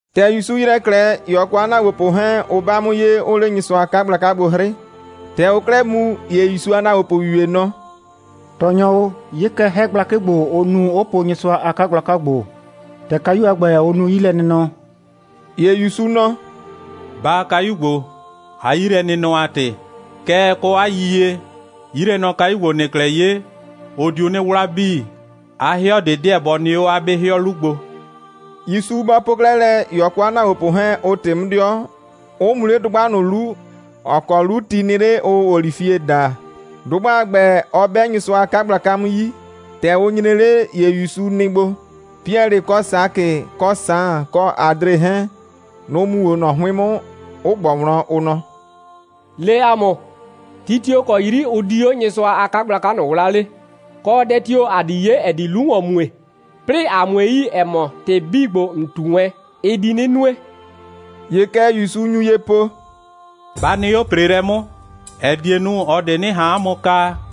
‑Tɛ ‑Yusu ‑yrɛ 'klɛɛ, ‑ye ɔ kɔ 'a ‑naagbopʋ 'hɛɛn, ʋ 'ba 'mʋ ye, 'ʋʋ 'le Nyɩsʋa a 'kagblaka gbo 'hrɩ. ‑Tɛ ʋʋ 'klɛɛ mu, ‑ye ‑Yusu a ‑naagbopʋyu ‑ye nɔ: «Tɔɔnyɔ o, 'ye kɛ, 'hɛ gblakɩ ‑gbo, ʋ nu, 'ʋ po Nyɩsʋa a 'kagblaka ‑gbo, ‑tɛ kayu a ‑gbɛ, ʋ nu 'yilɛnɩnɔ.» ‑Ye ‑Yusu nɔ: «Baa kayu ‑gbo, 'a 'yilɛnɩnɔ a ‑tɩ. Kɛɛ, kɔ 'a yiyie, 'yilɛnɔkayu ‑gbo, ‑nɩɩ 'klɛɛ 'ye, ʋ diu 'nɩ 'wla 'bii. 'A 'hɩɔ ꞊de 'deɛ bɔ nɩ 'o 'a 'be 'hɩɔ 'lu gbo.» ‑Yusu bɔ po 'klɛɛ lɛ, ‑ye ɔ kɔ 'a ‑naagbopʋ 'hɛɛn, ʋ ꞊tɩ 'mʋ 'dɩɔ, 'ʋ mu 'le dʋgba ꞊nʋ 'lu, ‑ɔ kɔ 'lu ti nɩ 'le, ʋʋ olifie daa. Dʋgba a ‑gbɛ, ɔ 'bɛ Nyɩsʋa a 'kagblaka 'mʋ 'yi. ‑Tɛ ʋ nyre 'le, ‑ye ‑Yusu nɩ gbo. Piɛlɩ, kɔ Sakɩ, kɔ Saan, kɔ Adre 'hɛɛn, nʋ‑ mu 'o ꞊nɔ 'hʋɩn 'mʋ, 'ʋ ꞊gbɔ wlɔn, ʋ nɔ: «Le ‑a mʋ, ti tio‑ kɔ 'yri ʋ di 'o Nyɩsʋa a 'kagblaka ꞊nʋ 'wlaa 'le, kɔ, dɛ tio‑ ‑a di 'ye, ‑ɛ di 'lu ‑wɔn mue, 'plɩɩ ‑a 'mue yi, ‑ɛ mɔ, ‑tɩ 'bii ‑gbo, ‑n ꞊tu wɛn, ɩ di 'nɩ nue?» ‑Ye kɛ ‑Yusu nyu ye po: «Ba nɩ 'o ‑preelɛ 'mʋ, ‑ɛ die nu, ꞊ɔ ꞊de 'nɩ ꞊han 'a mʋ kaa,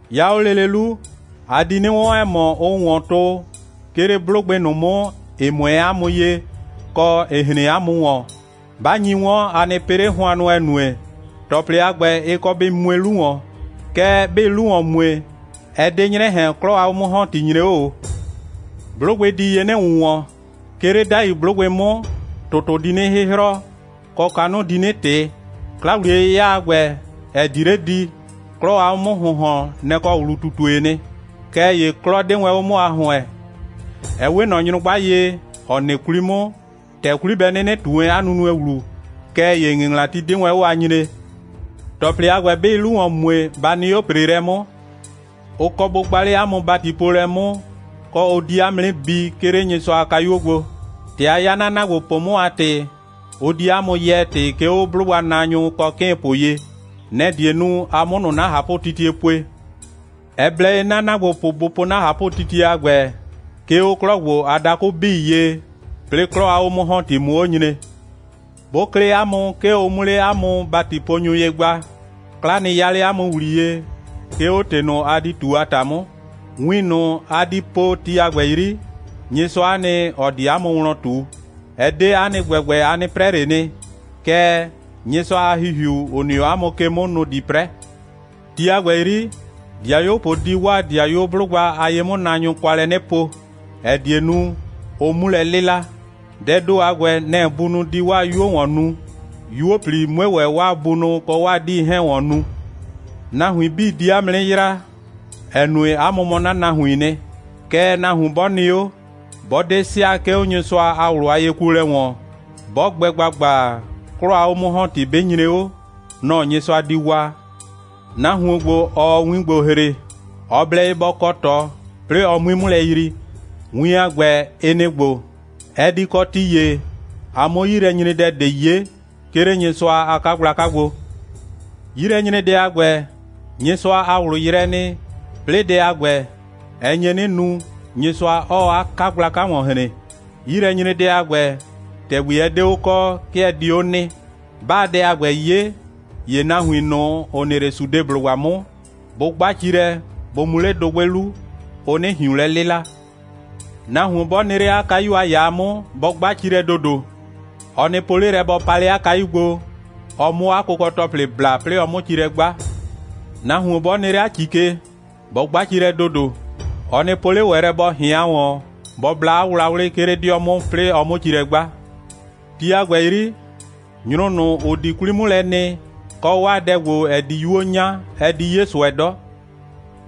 'Ya 'o lele 'lu, a di 'nɩ 'wɔn, ‑ɛ mɔ, ʋʋ ‑wɔn tʋ, 'ke 'le 'blʋgbɩ ꞊nʋ 'mʋ, ‑ɩ 'mʋɛɛ 'a mʋ ye, kɔ, ‑ɩ hren 'a mʋ ‑wɔn. 'Ba nyi 'wɔn, a nɩ pɩ 'le hʋannʋ, ‑ɛ nue, ‑tɔplɩ a ‑gbɛ, ɩ kɔ bɩ mue 'lu ‑wɔn. Kɛɛ, 'bɩɩ 'lu ‑wɔn mue, ɛ 'de 'nyrɛ ꞊hɛn, 'klɔ a 'o'mʋ‑hɔnti nyre 'o ꞊o. 'Blʋgbɩ di ye 'nɩ ‑wʋnwɔn. 'Ke 'le 'dai 'blʋgbɩ 'mʋ, ‑tʋtʋ di 'nɩ 'hɩhrɔ, kɔ kanʋ di 'nɩ ꞊tɩ. 'Kla‑wliye'yɩya a ‑gbɛ, ‑ɛ di 'le di, 'klɔ a 'o'mʋ‑hʋnhɔn, nɛ‑ kɔ ‑wlu꞊tutue'e nɩ. Kɛɛ ‑ye 'klɔ 'de wɛn 'o 'mʋ a ‑hʋɛn. Ɛ 'we ꞊nɔ nyrʋgba ye, ‑ɔ nɩ 'kwli 'mʋ, ‑tɛ 'kwli bɛ 'nɩnɩ ꞊tu wɛn 'a nunue ‑wlu, kɛɛ ‑ye 'a ‑ŋɩŋlati 'de wɛn 'o a nyree. ‑Tɔplɩ a ‑gbɛ, 'bɩɩ 'lu ‑wɔn mue, ba nɩ 'o ‑preelɛ 'mʋ. Ʋ kɔ bʋ gba 'le 'a mʋ ‑batipoolɛ 'mʋ, kɔ, ʋ di 'a mʋ 'nɩ bi, 'ke 'le Nyɩsʋa a kayuo gbo. ‑Tɛ a 'ya 'na ‑naagbopʋ 'mʋ a ‑tɩ, ʋ di 'a mʋ yɛɛ ‑tɩ, 'ke 'o 'blʋgbanaanyʋ kɔ 'kɩɩnpʋ ye. Nɛ‑ die nu, a 'mʋ ꞊nʋ 'na ꞊hapʋtitie pue. Ɛ blɛ ye 'na ‑naagbopʋ bʋ po 'na ꞊hapʋtitie a ‑gbɛ, 'ke 'o 'klɔ ‑gbo a dakʋ 'bii ye, 'plɩɩ 'klɔ a 'o'mʋ‑hɔnti 'mʋ 'o nyre. 'Bʋ klɩ 'a mʋ, 'ke ʋ 'mʋ 'le 'a mʋ ‑batiponyʋ ye gba, 'kla nɩ 'ya 'le 'a mʋ ‑wliye, 'ke 'o ‑tɩ ꞊nʋ, a di ꞊tu a ‑ta 'mʋ. Win ꞊nʋ, a di po ti a ‑gbɛ 'yri, Nyɩsʋa'a nɩ, ‑ɔ di 'a mʋ wlɔn ꞊tu. Ɛ 'de 'a nɩ ‑gbɛgbɛ, a 'nɩ 'prɛ ꞊le nɩ, kɛɛ, Nyɩsʋa a ‑Hihiu, ‑ʋ nɩ 'o 'a mʋ ke 'mʋ, nʋ‑ di 'prɛ. Ti a ‑gbɛ 'yri, 'dɩayuopʋ di 'waa 'dɩayuo 'blʋgba a ye'mʋnaanyʋ kwa lɛ 'nɩ po, ‑ɛ die nu, ʋ 'mu lɛ 'lɩla. Dɛɛ ‑do a ‑gbɛ, nɛ‑ bunʋ di 'waa 'yuo ‑wɔn nu, 'yuo꞊pli 'mue ‑wɛ 'waa bunʋ kɔ 'waa 'diinʋ 'hɛɛn ‑wɔn nu. Nahuin 'bii di 'a mʋ 'nɩ yraa, ‑ɛ nue, 'a mʋ mɔ 'na nahuiin nɩ. Kɛɛ, nahuon 'bɔ nɩ 'o, 'bɔ 'de sɩa, 'ke 'o Nyɩsʋa a ꞊wlʋ a yekuolɛ ‑wɔn, 'bɔ gbɛ ‑gbagba, 'klɔ a 'o'mʋ‑hɔnti 'bɩ nyre 'o, nɔ‑ Nyɩsʋa di waa.» «Nahuon ‑gbo, ‑ɔɔ win ‑gbo ‑hre, ɔ blɛ ye bɔ kɔ ꞊tɔ, 'plɩɩ ɔ 'mui 'mʋ lɛ yrii. Win a ‑gbɛ, ɩ nɩ‑ ‑gbo: Ɛ di kɔ ti ‑ye, a 'mʋ 'yilɛnyredɛ ꞊de 'ye, 'ke 'le Nyɩsʋa a 'kagblaka gbo. 'Yilɛnyredɛ a ‑gbɛ, Nyɩsʋa a ꞊wlʋ yrɛɛ nɩ, 'plɩɩ dɛ a ‑gbɛ, ɛ nye 'nɩ nu, Nyɩsʋa 'ɔɔ 'a 'kagblaka ‑wɔn hren. 'Yilɛnyredɛ a ‑gbɛ, ‑tɛgbi ɛ 'de 'o kɔ, 'ke ɛ di 'o nɩ. 'Baa dɛ a ‑gbɛ 'ye, ‑ye nahuin ꞊nʋ, ‑ʋ nɩ 'le Sudeblʋgba 'mʋ, bʋ 'gba ci lɛ, bʋ mu 'le dʋgbɩ 'lu, ʋ 'nɩ ꞊hiun lɛ 'lɩla. Nahuon 'bɔ nɩ 'le 'a kayu a ‑yaa 'mʋ, bɔ 'gba ci lɛ ‑dodo. Ɔ nɩ po 'le lɛ, bɔ pa 'le 'a kayu gbo, ɔ 'mʋ 'a kʋkɔ‑tɔplɩ bla, 'plɩɩ ɔ 'mʋ ci lɛ 'gba. Nahuon 'bɔ nɩ 'le 'a ‑ci ke, bɔ 'gba ci lɛ ‑dodo. Ɔ nɩ po 'le ‑wɛ lɛ, bɔ ꞊hɩan ‑wɔn, bɔ bla 'a wlawlɩ, 'ke 'le 'dɩɔ 'mʋ, 'plɩɩ ɔ 'mʋ ci lɛ 'gba. Ti a ‑gbɛ 'yri, nyrʋ ꞊nʋ, ‑ʋ di 'kwlii 'mʋ lɛ nɩ, kɔ 'waa dɛ ‑gbo, ‑ɛ di 'yuo 'nya, ɛ di 'ye ꞊sʋɛ 'dɔ.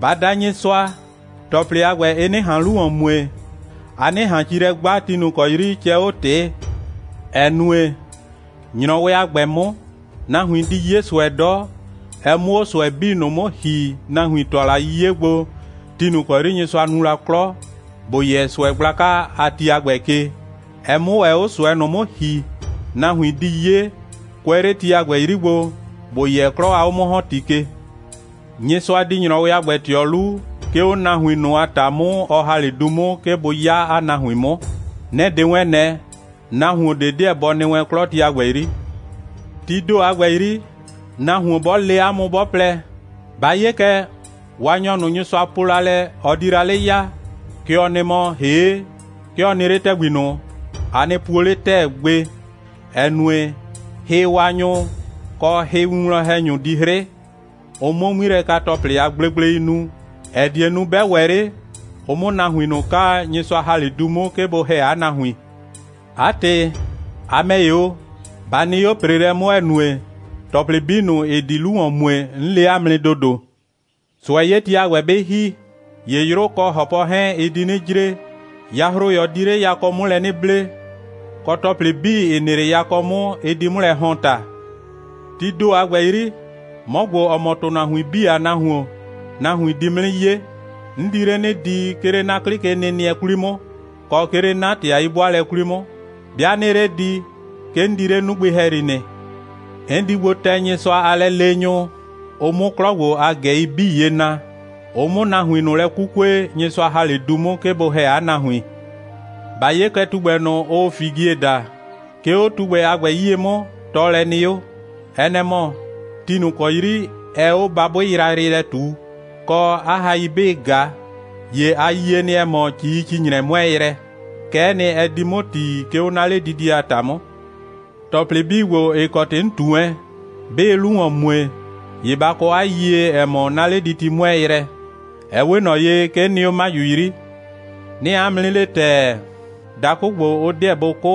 Ba da Nyɩsʋa, ‑tɔplɩ a ‑gbɛ, ɩ 'nɩ ꞊han 'lu ‑wɔn mue, a 'nɩ ꞊han ci lɛ 'gba, ti ꞊nʋ ‑kɔ 'yri cɛɛ 'o ꞊tɩɩ, ‑ɛ nue, ‑nyrɔwɩ a ‑gbɛ 'mʋ, nahuin di 'ye ꞊sʋɛ 'dɔ, ɛ 'mʋ 'o ꞊sʋɛ 'bii ꞊nʋ 'mʋ ‑hi, nahuin ‑tʋa la 'le 'yiye gbo, ti ꞊nʋ ‑kɔ 'yri Nyɩsʋa nu la 'klɔ, ‑bo yɛ ꞊sʋɛ gblaka a ti a ‑gbɛ ke, ɛ 'mʋ ‑wɛ 'o ꞊sʋɛ ꞊nʋ 'mʋ ‑hi, nahuin di 'ye, kʋɛ 'le ti a ‑gbɛ 'yri gbo, ‑bo yɛ 'klɔ a 'o'mʋ‑hɔnti ke. Nyɩsʋa di ‑nyrɔwɩ a gbɛ ꞊tɩɔ 'lu, 'ke 'o nahuin ꞊nʋ a ‑ta 'mʋ, ɔ ‑ha 'le du 'mʋ, 'ke bʋ 'ya 'a nahuin 'mʋ. Nɛ‑ 'de wɛn ꞊nɛ, nahuon ꞊de 'deɛ bɔ nɩ wɛn 'klɔ ti a ‑gbɛ 'yri. Tii ‑do a ‑gbɛ 'yri, nahuon 'bɔ le 'a mʋ, 'bɔ plɛ: Ba 'ye kɛ, Waanyɔ ꞊nʋ, Nyɩsʋa po la lɛ, ɔ di la 'le ya, kɛ ɔ nɩ mɔ, ‑hee' 'ke ɔ nɩ 'le ‑tɛgbi ꞊nʋ, a nɩ puo 'le ‑tɛɛ gbe, ‑ɛ nue, hɩwaanyʋ, kɔ hɩwinwlɔn‑hɛnyʋ di 'hrɩ, ʋ 'mʋ 'ŋmilɛka‑tɔplɩ a gblegblei nu, ‑ɛ die nu, 'bɛ ‑wɛ 'le, ʋ 'mʋ nahuin ꞊nʋ kaa, Nyɩsʋa ‑ha 'le du 'mʋ, 'ke bʋ ‑hɛ 'a nahuin. 'A ‑tɩ, a ‑mɛ ‑ye o, ba nɩ 'o ‑preelɛ 'mʋ, ‑ɛ nue, ‑tɔplɩ 'bii ꞊nʋ, ‑ɩ di 'lu ‑wɔn mue, 'n le 'a mʋ nɩ ‑dodo.» «꞊Sʋɛ'yeti a ‑gbɛ 'bɩ ‑hi, ‑ye 'yrʋ kɔ ‑hɔpɔ 'hɛɛn, ɩ di 'nɩ jre, yahroyɔ di 'le yakɔ 'mʋ lɛ 'nɩ ble, kɔ ‑tɔplɩ 'bii, ‑ɩ nɩ 'le yakɔ 'mʋ, ɩ di 'mʋ lɛ ‑hɔn ‑ta. Tii ‑do a ‑gbɛ 'yri, 'mɔ ‑gbo, ‑ɔ mɔ ‑tʋnahuin 'bii a Nahuon, nahuin di 'mʋ 'nɩ 'ye. 'N di 'le 'nɩ di, 'ke 'le 'na 'klɩ a kenɩnɩɛ 'kwli 'mʋ, kɔ 'ke 'le 'na ‑tɩ a 'yi'bʋaalɛ 'kwli 'mʋ. 'Bɩa 'nɩɩ 'le di, 'ke 'n di 'le 'nugbɩ ‑hɛyri nɩ. 'N di gbo tɛ Nyɩsʋa a lɛleenyʋ, ʋ 'mʋ 'klɔ ‑gbo a ꞊gɛi 'bii ye na, ʋ 'mʋ nahuin ꞊nʋ lɛ 'kukue, Nyɩsʋa ‑ha 'le du 'mʋ, 'ke bʋ ‑hɛ 'a nahuin.» «Ba 'ye kɛ tugbɛ ꞊nʋ, ʋʋ figie daa. 'Ke 'o tugbɛ a ‑gbɛ 'yie 'mʋ, tɔɔlɛ nɩ 'o. Ɛ nɛ‑ mɔ, ti ꞊nʋ ‑kɔ 'yri ɛɛ 'o babʋɩ yrayrɩ lɛ ꞊tuu, kɔ, 'a hai 'bɩɩ ꞊ga, ‑ye ‑a yie nɩ, ‑ɛ mɔ, ‑cii‑ci‑nyrɛ 'mʋɛɛ yrɛ. Kɛ'ɛ nɩ, ɛ di 'mʋ ‑ti, 'ke 'o 'na 'ledidie a ‑ta 'mʋ. ‑Tɔplɩ 'bii ‑gbo, ‑ɩ kɔ ‑tɩ 'n ꞊tu wɛn, 'bɩɩ 'lu ‑wɔn mue, ‑ye ba kɔ 'a yiyie, ‑ɛ mɔ, 'na 'lediti 'mʋɛɛ yrɛ. Ɛ 'we ꞊nɔ ye, 'ke 'n nɩ 'o 'maju 'yri. 'Nɩɩ 'a mʋ 'nɩ le ‑tɛɛ, dakʋ ‑gbo, ʋ 'deɛ bʋ 'kʋ,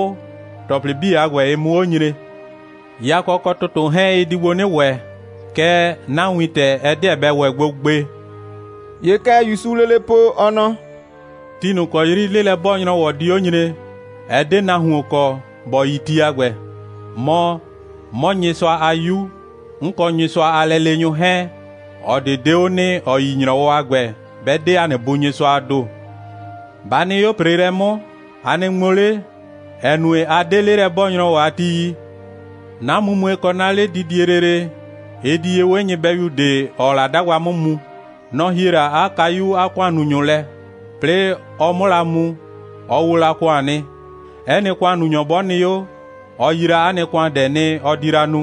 ‑tɔplɩ 'bii a ‑gbɛ, ɩ 'mʋ 'o nyre. Yakɔ kɔ ‑tʋtʋ 'hɛɛn, ɩ di gbo 'nɩ ‑wɛ, kɛɛ, 'na wintɛ, ɛ 'deɛ bɛ ‑wɛ gbo gbe.» ‑Ye kɛ ‑Yusuu lele po, ɔ nɔ: «Ti ꞊nʋ ‑kɔ 'yri 'lelɛ'bɔɔ‑nyrɔwɔ di 'o nyre, ɛ 'de nahuon kɔ, ‑bɔ yi ti a ‑gbɛ. Mɔ, 'mɔ, Nyɩsʋa a 'Yu, 'n kɔ Nyɩsʋa a lɛleenyʋ 'hɛɛn, ꞊ɔ ꞊de 'de 'o nɩ, ‑ɔ yi ‑nyrɔwɔ a ‑gbɛ, 'bɛ 'de ‑a nɩ Bu Nyɩsʋaa ‑do. Ba nɩ 'o ‑preelɛ 'mʋ, a nɩ ŋmo 'le, ‑ɛ nue, a 'de 'lelɛ'bɔɔ‑nyrɔwɔ a ti yi. 'Na mumue kɔ 'na 'ledidie lele, ɩ di ye 'we nyɩbɛyu ꞊de, ‑ɔɔ la 'dagba 'mʋ mu. Nɔ‑ hie la 'a kayu 'a ‑kʋannunyʋ lɛ. 'Plɩɩ ɔ 'mʋ la mu mu, ɔ wo la ‑kʋan nɩ. 'Ɛ nɩ ‑kʋannunyɔ 'bɔ nɩ 'o, ɔ yi la 'a nɩ ‑kʋandɛ nɩ, ɔ di la nu.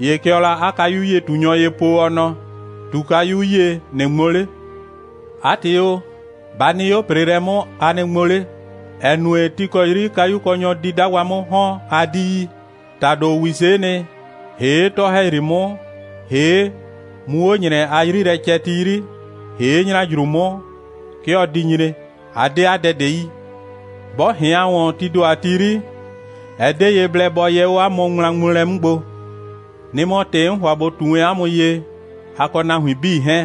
‑Ye kɛ ɔɔ la 'a kayu'yie꞊tunyɔ ye po, ɔ nɔ: ꞊Tu kayu 'yie, ꞊nɩ ŋmo 'le. 'A ‑tɩ o, ba nɩ 'o ‑preelɛ 'mʋ, a nɩ ŋmo 'le, ‑ɛ nue, ti ‑kɔ 'yri kayukɔnyɔ di 'dagba 'mʋ ‑hɔn, a 'di yi. ‑Tado ‑wise'e nɩ, ‑hee' 'tɔ‑hɛyri 'mʋ, ‑hee' mu 'o ‑nyrɛ a 'yrilɛcɛti 'yri, ‑hee' ‑nyrajru 'mʋ, 'ke ɔ di nyre. A 'de 'a dɛ ꞊de yi. 'Bɔ ꞊hɩan ‑wɔn tii ‑do a ti 'yri, ɛ 'de ye blɛ, bɔ yɛ 'o 'a mʋ ŋmlaŋmoolɛ 'mʋ gbo. Nɩ‑ mɔ ‑tɩ 'n ‑hʋa ꞊bo ꞊tu wɛn 'a mʋ ye, a kɔ nahuin 'bii 'hɛɛn: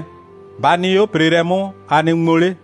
Ba nɩ 'o ‑preelɛ 'mʋ, a nɩ ŋmo 'le.»